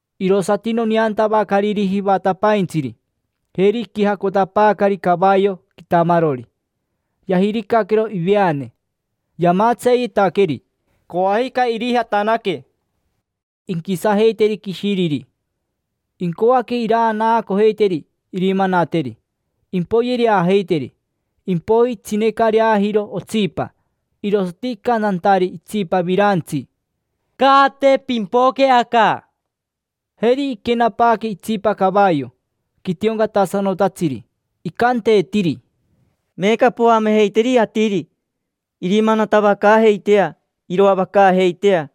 Irosati noneantavacariri jivatapaintsiri: jeri iquijacotapaacari cavayo quitamarori, yajiricaquero iveane. Yamatseeyeetaqueri; coajica irijatanaque inquisajeiteri quishiriri, incoaque iranaacojeiteri irimanateri, impoyereajeiteri. Impoiji itsinecareajiro otsipa, irosati icantantari itsipa virantsi: —Caate, pimpoque aca. Jeri iquenapaaque itsipa cavayo, quitioncatasanotatsiri. Icanteetiri: —Meeca poamejeiteri atiri irimanatavacaajeitea, iroavacaajeitea.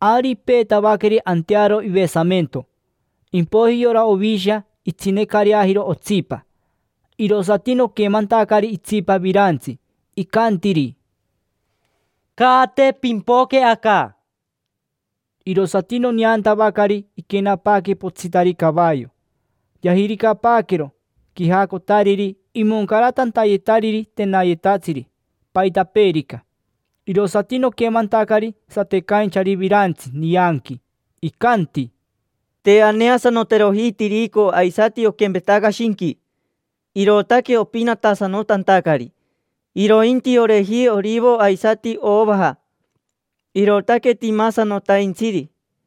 Ari ipeetavaqueri antearo ivesamento. Impoiji yora Ovisha itsinecareajiro otsipa, irosati noquemantacari itsipa virantsi, icantiri: —Caate, pimpoque aca. Irosati noneantavacari iquenapaaque potsitari cavayo, yajiricapaaquero quijacotariri imoncaratantayetariri tenayetatsiri, paitapeerica. Irosati noquemantacari satecainchari virantsi nianqui, icanti: —Te aneasanoteroji tirico aisati oquempetaca shinqui, irootaque opinatasanotantacari. Irointi oreji orivo aisati ovaja, irootaque timasanotaintsiri.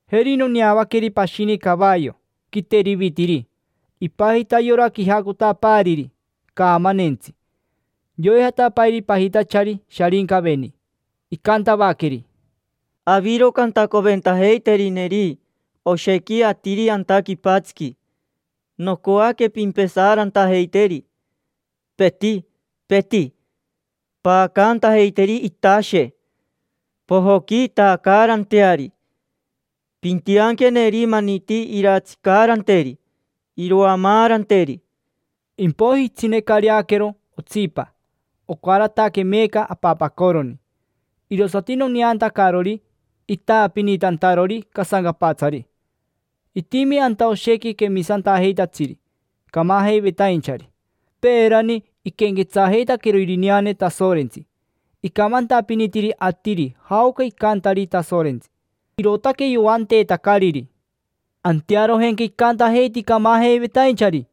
Jeri noneavaqueri pashini cavayo, quiterivitiri; ipajita yora quijacotapaariri: Caamanentsi. Yoijatapairi pajitachari Sharincaveni. Icantavaqueri: —Aviro cantacoventajeiterineri oshequi atiri anta quipatsiqui, nocoaque pimpesaarantajeiteri, peti, peti; paacantajeiteri itashe; pojoquiitacaaranteari; pintianqueneri maniti irantsicaaranteri, irovamaaranteri. Impoiji itsinecareaquero otsipa, ocarataque meeca apapacoroni; irosati noneantacarori itaapinitantarori casancapatsari. Itimi anta oshequi quemisantajeitatsiri, camajeivetainchari. Peerani iquenquetsajeitaquero irineane Tasorentsi, icamantapinitiri atiri jaoca icantari Tasorentsi, irootaque yoanteetacariri. Antearojenca icantajeiti camajeivetainchari: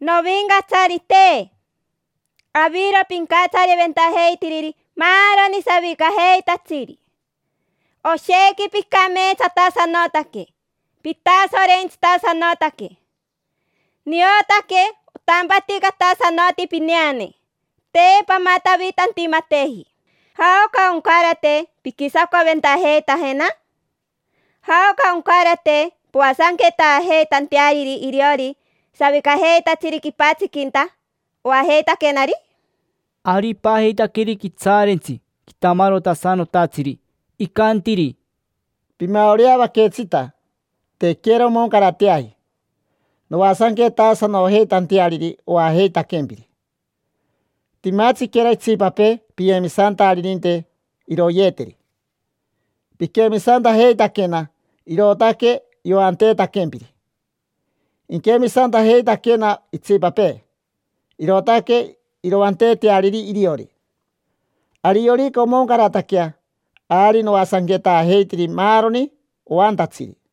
—Novincatsarite, aviro pincatsariventajeitiriri maaroni savicajeitatsiri. Oshequi picameetsatasanotaque, pitasorentsitasanotaque. Niotaque otampaticatasanoti pineane, te pamatavitantimateji. ¿Jaoca oncarate pinquisacoventajeitajena? ¿Jaoca oncarate poasanquetaajeitanteariri iriori savicajeitatsiri quipatsiquinta, oajeitaquenari? Ari ipajeitaqueri quitsaarentsi quitamarotasanotatsiri. Icantiri: —Pimaoreavaquetsita. Tequera omoncarateaji noasanquetaasanojeitanteariri oajeitaquempiri. Timatsiquera itsipapee piyemisantaririnte iroyeeteri. Piquemisantajeitaquena, irootaque yoanteetaquempiri; inquemisantajeitaquena itsipapee, irootaque iroanteeteariri iriori. Ariorica omoncarataquea, ari noasanquetaajeiteri maaroni oantatsiri.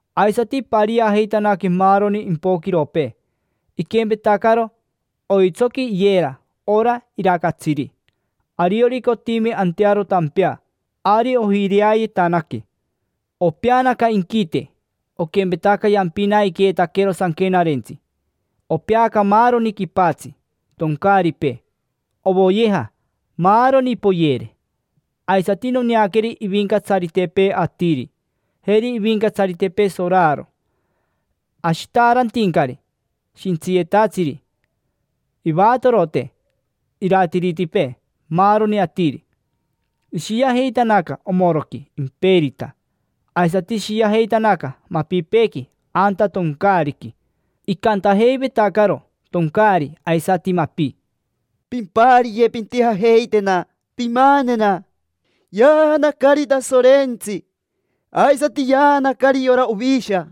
Aisati ipariajeitanaque maaroni impoquiropee: iquempetacaro oitsoqui iyera ora iraacatsiri, ariorica otimi antearo tampea, ari ojireayetanaque. Opeanaca inquite, oquempetaca yampinaiqueetaquero sanquenarentsi. Opeaca maaroni quipatsi: toncaaripee, ovoyeja, maaroni; poyere. Aisati noneaqueri ivincatsaritepee atiri, jeri ivincatsaritepee soraro, ashitaarantincari, shintsiyetatsiri, ivatorote, iratiritepee, maaroni atiri: ishiajeitanaca omoroqui imperita. Aisati ishiajeitanaca mapipeequi anta toncaariqui. Icantajeivetacaro toncaari aisati mapi: —Pimpariye, pintijajeitena, pimanena. Yaanacari Tasorentsi, aisati yaanacari yora Ovisha.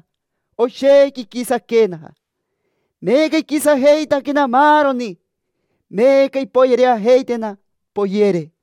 Oshequi iquisaquena. Meeca iquisajeitaquena maaroni; meeca impoyereajeitena, poyere.